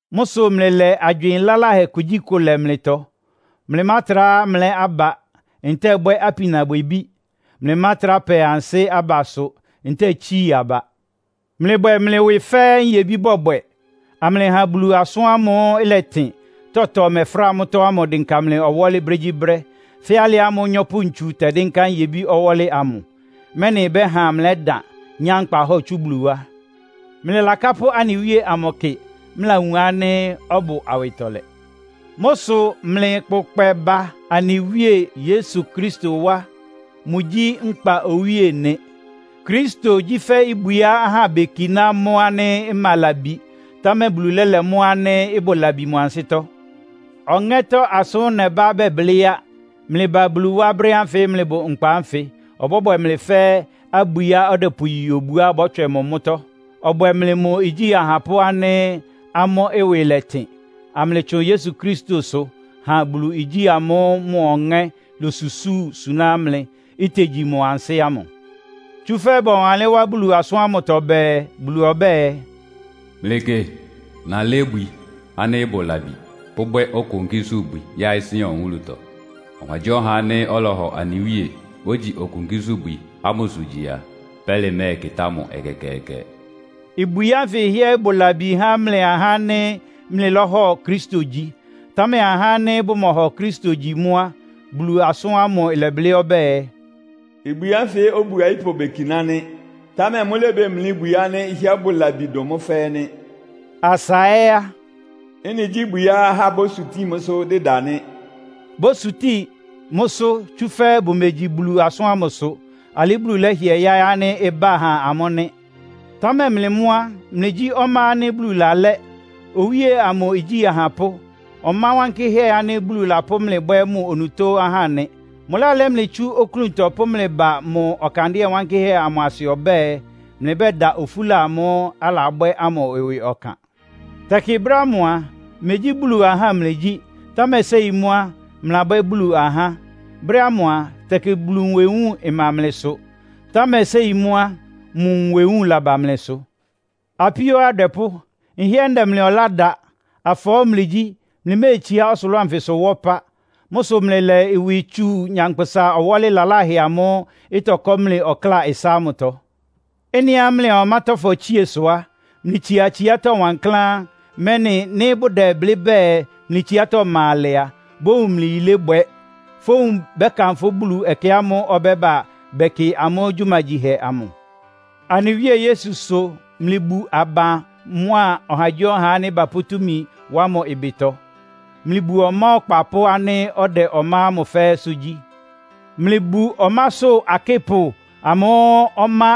Mʋ́ sʋ mlɩlɛ agywɩɩn laláhɛ kugyíkʋ lɛ mlɩtɔ. Mlɩmátrá mlɛ́ aba, ntɛ́ɛ bwɛ́ apinabwɛbí. Mlɩmátrá pɛ ansɩ́ abasʋ, ntɛ́ɛ tsii aba. Mlɩbwɛ mlɩ ɩwɩ fɛ́ nyebí bɔbwɛ, amlɩha Bulu asʋ́n ámʋ́ʋ́ ɩlɛtɩn, tɔtɔ mɛfráa mʋ́tɔ́ ámʋ ɩdɩnka mlɩ ɔwɔ́lɩ brégyíbrɛ́, fɛ́ alɩ ámʋ́ʋ́ nyɔ́pʋ-ntsu tɛdɩ́nká nyebí ɔwɔ́lɩ amʋ. Mɛ́nɩ ɩbɛ́ha mlɛ́dan, nyá nkpahɔ́ɔ tsú Bulu wá. Mlɩlakápʋ́ anɩ Wíe amʋ kɩ, mlɩlawun ánɩ́ ɔbʋ awɩtɔlɛ. Mʋ́ sʋ mlɩkpʋkpɛ ba anɩ Wíe Yesu Kristo wá. Mʋgyí nkpa Owíe nɩ. Kristo gyí fɛ́ ibwiá ahá bekiná mʋ́ ánɩ́ ɩma labi, támɛ Bulu lɛ́lɛ mʋ́ ánɩ́ ɩbʋ labi mʋ ansɩ́tɔ́. Ɔŋɛ́tɔ́ asʋ́n nɛbá bɛblɩ́ á. Mlɩba Bulu wá brɛ́ ánfɩ mlɩbʋ nkpa ánfɩ, ɔbwɛ mlɩ fɛ́ abwiá ɔdɛpʋyi obuá bɔ́tswɛ mʋ mʋ́tɔ́. Ɔbwɛ mlɩ mʋ igyí ahapʋ́ ánɩ́ amʋ́ ɩwɩ lɛ́tɩn, amlɩtsʋn Yesu Kristosʋ ha Bulu igyí ámʋ́ʋ́ mʋ Ɔŋɛ́ losusúu suná mlɩ, itegyi mʋ ansɩ́ ámʋ. Tsúfɛ́ bɔwanlɩ́n wá Bulu asʋ́n ámʋtɔ bɛɛ, “Bulu ɔbɛ́ɛ, mlɩkɩ, nalɛ́ ibwi ánɩ́ ɩbʋ labi, pʋ́bwɛ́ okonkísʋ́bwi yáɩ́ Sion wúlutɔ. Ɔhagyíɔha ánɩ́ ɔlɔhɔ anɩ Wíe, ogyi okonkísʋ́bwi ámʋsʋ gyi a, pɛ́lɩ mɛ́ɛkɩtá mʋ ɛkɛkɛɛkɛ.” Ibwi ánfɩ hɩ́ɛ́ ɩbʋ labi há mlɩ ahá ánɩ́ mlɩlɔ́hɔ Kristo gyi. Támɛ há ahá ánɩ́ bʋmɔ́ɔhɔ Kristo gyi mʋ́ á, Bulu asʋ́n ámʋ ɩlɛblɩ́ ɔbɛ́ɛ, “Ibwi ánfɩ obu ayípʋ bekiná nɩ́. Támɛ mʋ́lébemlí ibwi ánɩ́ ɩhɩ́ɛ́ bʋ labi dʋn mʋ́ fɛ́ɛ́ nɩ́.” Asa ɛ́ á, “Ɩ́nɩ gyí ibwiá ahá bósutíin mʋ́sʋ́ dɩda nɩ́.” Bósutíin mʋ́sʋ́, tsúfɛ́ bʋmegyi Bulu asʋ́n ámʋsʋ. Alɩ́ Bulu lɛ́hɩɛ yáɩ́ ánɩ́ ɩbá ha amʋ́ nɩ. Támɛ mlɩ mʋ́ á, mlɩgyí ɔmá ánɩ́ Bulu lalɛ́. Owíe amʋ igyí ahapʋ́. Ɔmá wankɩ́hɛ́ ánɩ́ Bulu lapʋ́ mlɩ bwɛ́ mʋ onutó ahá nɩ. Mʋlálɛ́ mlɩ tsú oklúntɔ pʋ́ mlɩ ba mʋ ɔkandɩ́ɛ wánkɩ́hɛ́ amʋ asɩ ɔbɛ́ɛ, mlɩbɛ́da ofúla amʋ́ʋ́ alabwɛ́ ámʋ ɩwɩ ɔkan. Tɛkɩ brɛ́ ámʋ a, megyí Bulu ahá mlɩgyí. Támɛ séi mʋ́ á, mlɩlabwɛ́ Bulu ahá. Brɛ́ ámʋ a, tɛkɩ Bulu nwewúun ɩma mlɩsʋ. Támɛ séi mʋ́ á, mʋ nwewúun laba mlɩsʋ. Apíó adwɛpʋ́, nhɩ́ɛ́ ndɛ mlɩ ɔlá da. Afɔɔ́ mlɩgyí, mlɩméetsiá ɔsʋlʋ́ʋ anfɩsʋ wá ɔpá. Mʋ́ sʋ mlɩlɛ ɩwɩ tsu nyankpʋsa ɔwɔ́lɩ laláhɛ amʋ́ʋ́ ɩtɔkɔ́ mlɩ ɔkláa ɩsá ámʋtɔ. Ɩ́nɩá mlɩa ɔmátɔ́fɔ tsíe sʋ á, mlɩtsia tsiátɔ́ wankláán, mɛ́nɩ nɩ́ bʋdɛblɩ́ bɛɛ mlɩ tsiátɔ́ ɩma alɛ a, bówun mlɩ yilébwɛ, fówun bɛ́kanfʋ́ Bulu ɛkɛ ámʋ́ʋ́ ɔbɛ́ba bɛkɩ amʋ́ gyumagyihɛ amʋ. Anɩ Wíe Yesu sʋ mlɩbu aban mʋa ɔhagyíɔha ánɩ́ bapʋ́ túmi wá mʋ ɩbɩtɔ. Mlɩbu ɔmá ɔkpapʋ́ ánɩ́ ɔdɛ ɔmá ámʋ fɛ́ɛ́sʋ́ gyí. Mlɩbu ɔmásʋ́ akɩ́pʋ amʋ́ʋ́ ɔmá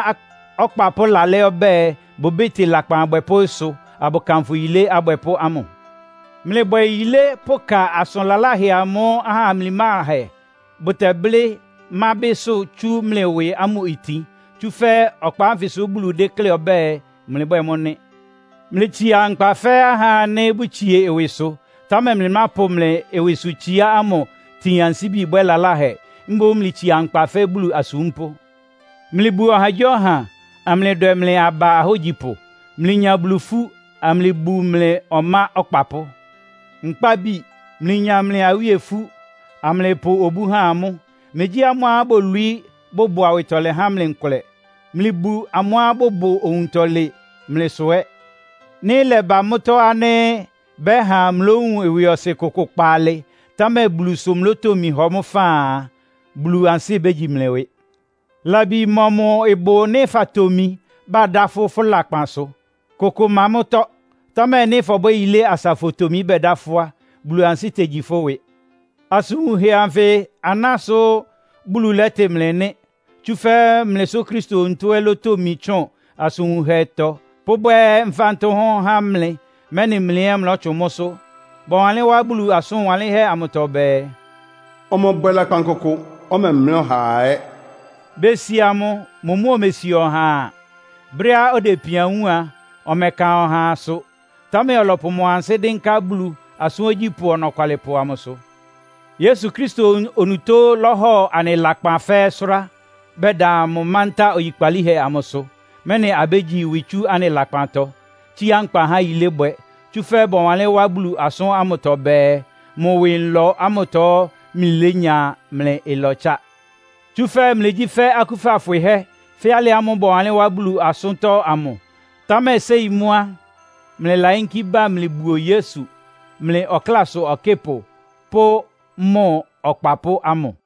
ɔkpapʋ́ lalɛ́ ɔbɛ́ɛ, bʋbɩ́tɩ lakpan abwɛpʋ́ ɩsʋ, abʋkanfʋ yilé abwɛpʋ́ ámʋ. Mlɩbwɛ yilé pʋka asʋn laláhɛ amʋ́ʋ́ aha mimláhɛ bʋtɛblɩ́ mábɩ́ sʋ tsú mlɩ ɩwɩ ámʋ itin. Tsúfɛ́ ɔkpa ánfɩsʋ Bulu déklé ɔbɛ́ɛ, mlɩbwɛ́ɛ mʋ́ nɩ́. Mlɩtsia nkpa fɛ́ ahá ánɩ́ bʋtsie ɩwɩsʋ, támɛ mlɩmápʋ mlɩ ɩwɩsʋtsiá ámʋ tin ansíbi bwɛ́ lalahɛ. Mboún mlɩtsia nkpa fɛ́ Bulu asúmpʋ́. Mlɩbu ɔhagyíɔha, amlɩdwɛ mlɩ aba ahógyipʋ. Mlɩnya Bulu ifú, amlɩbu mlɩ ɔmá ɔkpapʋ́. Nkpábi, mlɩnya mlɩ awíe ifú, amlɩpʋ obú ha amʋ́. Megyí amʋ́á bolwií, bʋbʋ awɩtɔlɛ há mlɩ nkʋlɛ. Mlɩbu amʋ́á bʋbʋ owuntɔlɩn mlɩsʋ ɛ́. Nɩ́ ɩlɛba mʋ́tɔ́ ánɩ́ bɛhá mlowun ɩwɩɔsɩn kʋkʋ kpaalɩ, támɛ Bulu sʋ́ mlotomi hɔ mʋ́ faan a, Bulu ansɩ́ bégyi mlɩ ɩwɩ. Labi mɔmʋ ɩbʋ nɩ́ fatomi, badá fʋ́ fʋ́ lakpan sʋ? Kʋkʋ ɩma mʋ́tɔ́. Támɛ nɩ́ fɔbwɛ́ yilé asa fotomi bɛda fʋ́ á, Bulu ansɩ́ tegyi fʋ́ ɩwɩ. Asʋn wunhɛ ánfɩ aná sʋ Bulu lɛ́tɩ mlɩ nɩ́. Tsúfɛ́ mlɩ sʋ Kristo onutó ɛ́ lótomi tsʋn asʋn wunhɛtɔ pʋ́bwɛ́ mfántʋ́hʋ́n há mlɩ, mɛ́nɩ mlɩ ɛ́ mlɔ́tsʋn mʋ́sʋ́. Bɔwanlɩ́n wá Bulu asʋn wanlɩ́nhɛ́ amʋtɔ bɛɛ, “Ɔmɔbwɛ lakpan kʋkʋ. Ɔmɛmlɛ́ ɔhaa ɛ́.” Besia mʋ, mʋ mʋ́ omesia ɔhaa. Brɛ́á ɔdɛ ipian wúun a, ɔmɛka ɔhaasʋ, támɛ ɔlɔpʋ mʋ ansɩ́ dɩ́nká Bulu, asʋ́n ogyípʋ́ ɔnɔkwalɩpʋ amʋsʋ. Yesu Kristo onutó lɔ́hɔ anɩ lakpan fɛ́ɛ́ sʋ́rá, bɛda mʋ mántá oyikpalíhɛ amʋsʋ, mɛ́nɩ abégyi ɩwɩ tsú anɩ lakpantɔ, tsíá nkpa há yilébwɛ. Tsúfɛ́ bɔwanlɩ́n wá Bulu asʋ́n ámʋtɔ bɛɛ, “Mʋ ɩwɩ nlɔ ámʋtɔ mlɩlénya mlɩ ɩlɔtsá.” Tsúfɛ́ mlɩgyí fɛ́ akúfa fwɩhɛ́, fɛ́ alɩ ámʋ́ʋ́ bɔwanlɩ́n wá Bulu asʋ́ntɔ́ ámʋ. Támɛ séi mʋ́ á, mlɩlayínkí bá mlɩbuo Yesu, mlɩ ɔklásʋ ɔkɩ́pʋ pʋ́ mʋ ɔkpapʋ́ ámʋ.